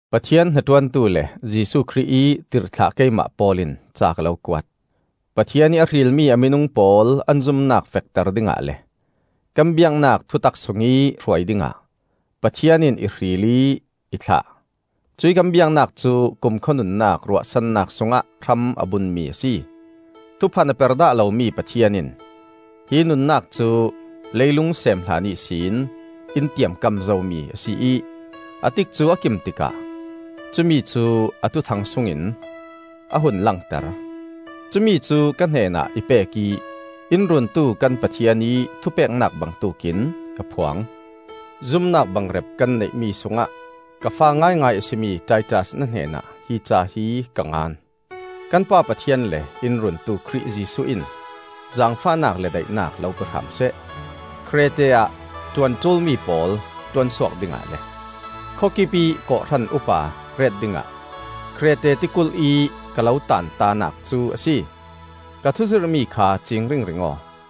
Pathian hnaṭuantu le Jesuh Khrih ih tirhthlah keimah Paul in ca ka lo kuat. Pathian ih a hrilmi a minung pawl an zumnak fekter dingah le kan biaknak thutak sungih hruai dingah Pathian in ih hril ih ih thlah. Cuih kan biaknak cu kumkhua nunnak ruahsannak sungah hram a bunmi a si. Thuphan a per dah lomi Pathian in hi nunnak cu leilung seem hlan ihsin in tiamkam zomi a si ih, a tikcu a kim tikah cumicu a Thuthang sungin a hun langter. Cumi cu ka hnenah i pek ih in Runtu kan Pathian ih thupeknak bangtuk in ka phuang. Zumnak bangrep kan neihmi sungah ka fa ngaingai a si mi Titas na hnenah hi ca hi ka ngan. Kan Pa Pathian le in Runtu Khrih Jesuh in zaangfahnak le daihnak lo pe hram seh. Krete ah ṭuan ṭulmi pawl ṭuansuak dingah le khawkip ih kawhhran upa ret dingah Krete tikulh-ih ka lo taantanak cu a si. Ka thuzirhmi kha ciing ringring aw.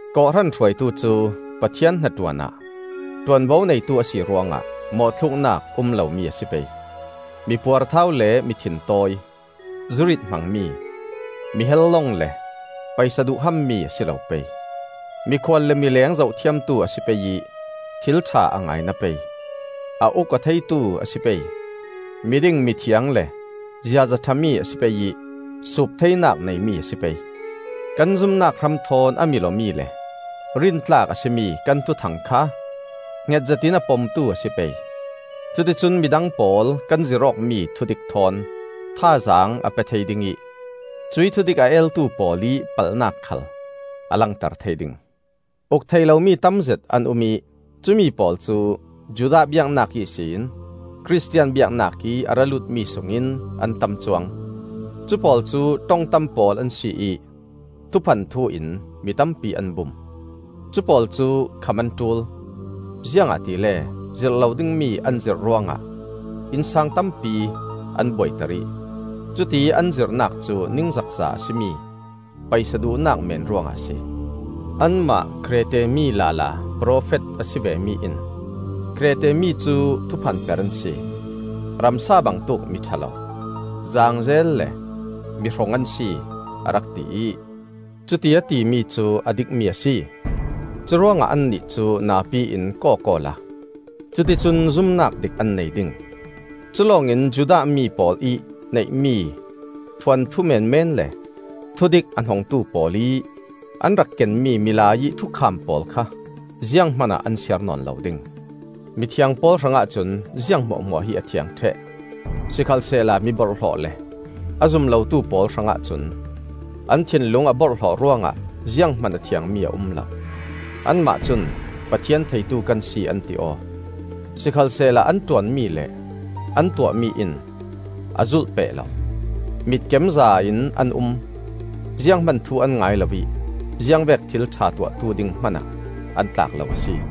Kawhhran hruaitu cu Pathian hnaṭuan ah ṭuanvo neitu a si ruangah mawhthluknak um lomi a si pei. Mi puarthau le mi thintawi, zurit hmangmi, mi helhlong le paisa duhham mi a si lo pei. Mikhual le mileng zohthiamtu a si pei ih thilṭha a ngaina pei. A uk-aw theitu a si pei; miding, mithiang le ziaza ṭhami a si pei ih suup theinak neimi a si pei. Kan zumnak hram thawn a mil-awmi le rintlak a si mi kan Thuthang kha hnget zetin a pomtu a si pei. Cuticun midang pawl kan zirh awkmi thudik thawn thazaang a pe thei ding ih cuih thudik a eltu pawl ih palhnak khal a langter thei ding. Uk theih lomi tamzet an um ih cumi pawl cu Judah biaknak ihsin Khristian biaknak ih a ra lutmi sungin an tam cuang. Cupawl cu ṭong tam pawl an si ih thuphan thu in mi tampi an bum. Cupawl cu kham an ṭul; ziangahtile zirh lo dingmi an zirh ruangah innsang tampi an buaiter ih cutiih an zirhnak cu ningzakza a si mi paisa duhnak meen ruangah a si. Anmah Krete mi lala profet a si vemi in, “Krete mi cu thuphan per an si, ramsa bangtuk miṭha lo, zaangzel le mihrong an si,” a rak ti ih, cuti a timi cu a dikmi a si. Curuangah annih cu napi in kawk awla cuticun zumnak dik an nei ding. Culawng in Judah mi pawl ih neihmi thuanthu meenmeen le thudik a hnongtu pawl ih an rak kenmi milai ih thukham pawl kha zianghman ah an siar nawn lo ding. Mithiang pawl hrangah cun ziang hmuahhmuah hi a thiang ṭheh; sikhalsehla miborhhlawh le a zum lotu pawl hrangah cun, an thinlung a borhhlawh ruangah zianghman a thiangmi a um lo. Anmah cun Pathian theitu kan si an ti aw; sikhalsehla an ṭuan mi le an tuahmi in a zulhpeh lo. Mitkemza in an um, zianghman thu an ngai lo ih ziangvek thil ṭha tuahtu ding hmanah an tlak lo a si.